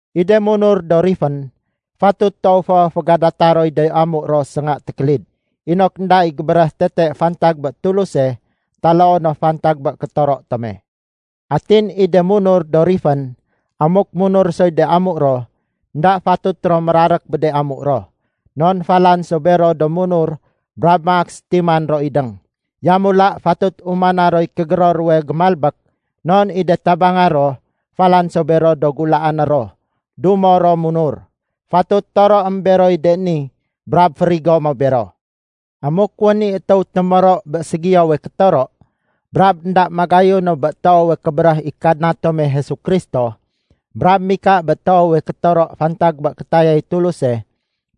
I de munur do rifén, fatut toow fo fégadata roy de amu ro sénga tékélid, inok énda i gébéréh tete fantag bé Tuluse taloo no fantag bé kétoro tome. Atin i de munur do rifén, amuk munur soy de amu ro, énda fatut ro mérarék bé de amu ro, non falan so bero do munur brab maak sétiman ro idéng. Yamula fatut umana roy kégéror ruwe gémalbék non i de tabangé ro, falan so bero do gulaané ro dumo ro munur. Fatut toroém beroy de ni brab férigo mo bero. Amuk wén i étéw témoro bé ségiyowe kétoro brab énda magayu no bé toowe kébéréh i Kadna tome Jesu Kristo brab mika bé toowe kétoro fantag bé kétayay Tuluse,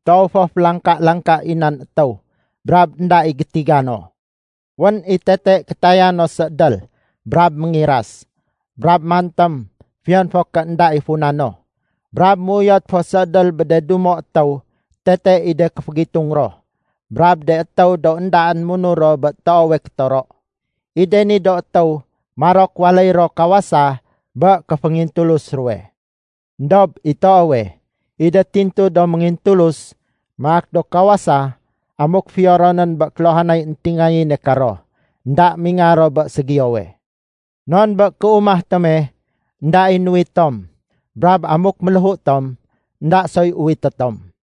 toow fo félangka-langka i nan étéw brab énda i gétiga no. Wén i tete kétaya no séédél brab méngiras, brab mantém fiyon fo ké énda i funa no, brab méuyot fo séédél bé de dumo étéw tete i de kéfégitung ro brab de étéw do éndaén munur ro bé toowe kétoro. I de ni do étéw marok waléy ro kawasa bé kéféngintulus ruwe. Endob i toowe, i de tintu do méngintulus maak do kawasa amuk fiyo ronén bé kéluhanay éntingayéne karo, énda mingar ro bé ségiyowe. Non bé kéumah tome, énda i nuwit tom. Brab amuk méléhu tom, énda soy uwité tom.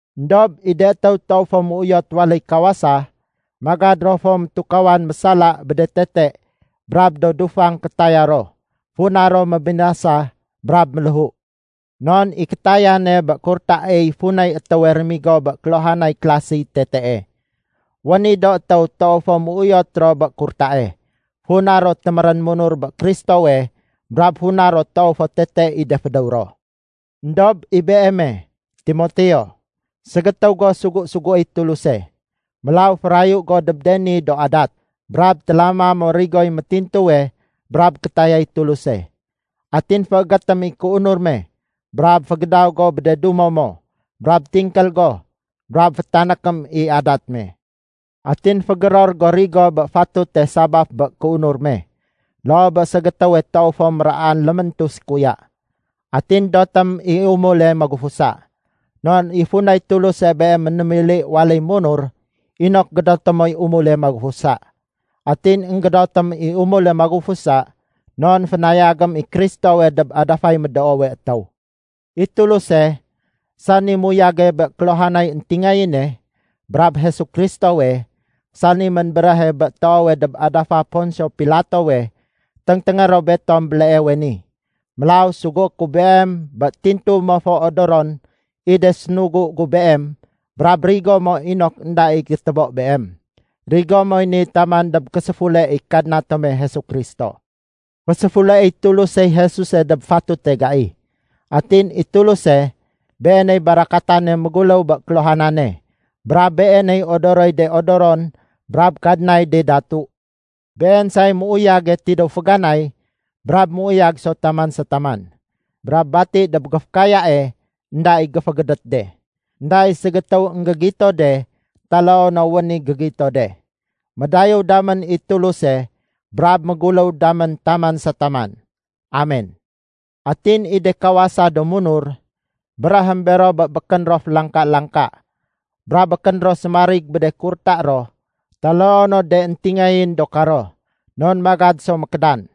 Endob i de étéw toow fo méuyot waléy kawasa, magad ro fo métukawan mésala bé de tete brab do dufang kétaya ro, funa ro mébinasa brab méléhu. Non i kétayane bé kurtaey funay étéwe rémigo bé kéluhanay kélasiy tetee. Wén i do étéw toow fo méuyot ro bé kurtae, funa ro témérén munur bé Kristowe brab funa ro toow fo tete i de fédéw ro. Endob i beeme, Timoteo, ségétéw go sugu-suguéy Tuluse. Mélaw férayu go dob de ni do adat. Brab télama mo rigoy métintuwe brab kétayay Tuluse. Atin féégétém i kéunur me, brab fégédaw go bé de dumo mo, brab tingkél go, brab fétanékém i adat me. Atin fégéror go rigo bé fatute sabaf bé kéunur me, loo bé ségétéwe toow fo méraan léméntu sékuya. Atin dotém i umule magufusa. Non i funay Tuluse beem ménémili waléy munur inok gédoté moy umule magufusa. Atin énggédotém i umule magufusa non fénayagém i Kristowe dob adafay médoowe étéw. I Tuluse, sani muyage bé kéluhanay éntingayéne, brab Jesu Kristowe, sani ménbéréhe bé toowe dob adafa Ponsio Pilatowe téngténgé ro betom béleewe ni. Mélaw sugué ku beem bé tintu mo fo odoron i de sénugu gu beem brab rigo mo inok énda i gétébo beem. Rigo moy ni taman dob késéfule i Kadna tome Jesu Kristo. Féséfuleéy Tulusey Jesuse dob fatute gai. Atin i Tuluse, Beeney barakatane méguléw bé kéluhanane, brab Beeney odoroy de odoron brab Kadnay de datu. Been say méuyage tidéw féganay brab méuyag so taman sa taman. Brab bati dob géfékayae énda i géfégédét de. Enda i ségétéw énggégito de taloo no wén i gégito de. Médayéw damén i Tuluse brab méguléw damén taman sa taman. Amen. Atin i de kawasa do munur, béréhém bero bé békén ro félangka-langka brab békén ro sémarig bé de kurta ro taloo no de éntingayén do karo, non magad so mékédan.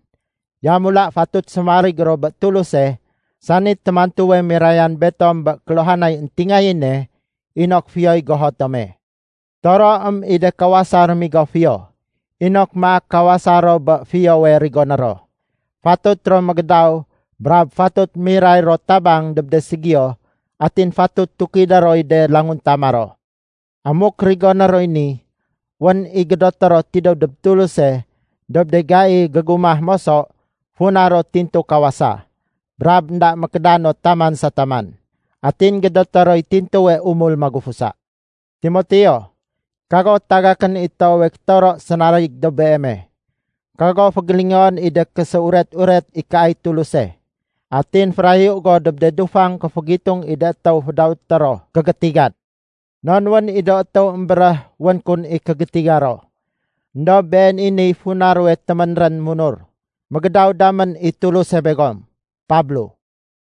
Yamula fatut sémarig ro bé Tuluse, sani témantuwe mirayan betom bé kéluhanay éntingayéne inok fiyoy goho tome. Toroém i de kawasa rémigo fiyo, inok maak kawasa ro bé fiyowe rigoné ro. Fatut ro mégédaw brab fatut miray ro tabang dob de ségiyo atin fatut tukidé roy de languntama ro. Amuk rigoné roy ni, wén i gédoté ro tidéw dob Tuluse dob de gai gégumah moso funa ro tintu kawasa, brab énda mékédan no taman sa taman. Atin gédoté roy tintuwe umul magufusa. Timoteo, kago tagakén i toowe kétoro sénarig dob beeme. Kago fégélingoén i de késéuret-uret ikaay Tuluse. Atin férayu go dob de dufang kéfégitung i de étéw fédawété ro “Kégétigan.” Non wén i do étéw émbéréh wén kun i kégétiga ro. Endob been i niy funa ruwe téménrén munur. Mégédaw damén i Tuluse begom. Pablo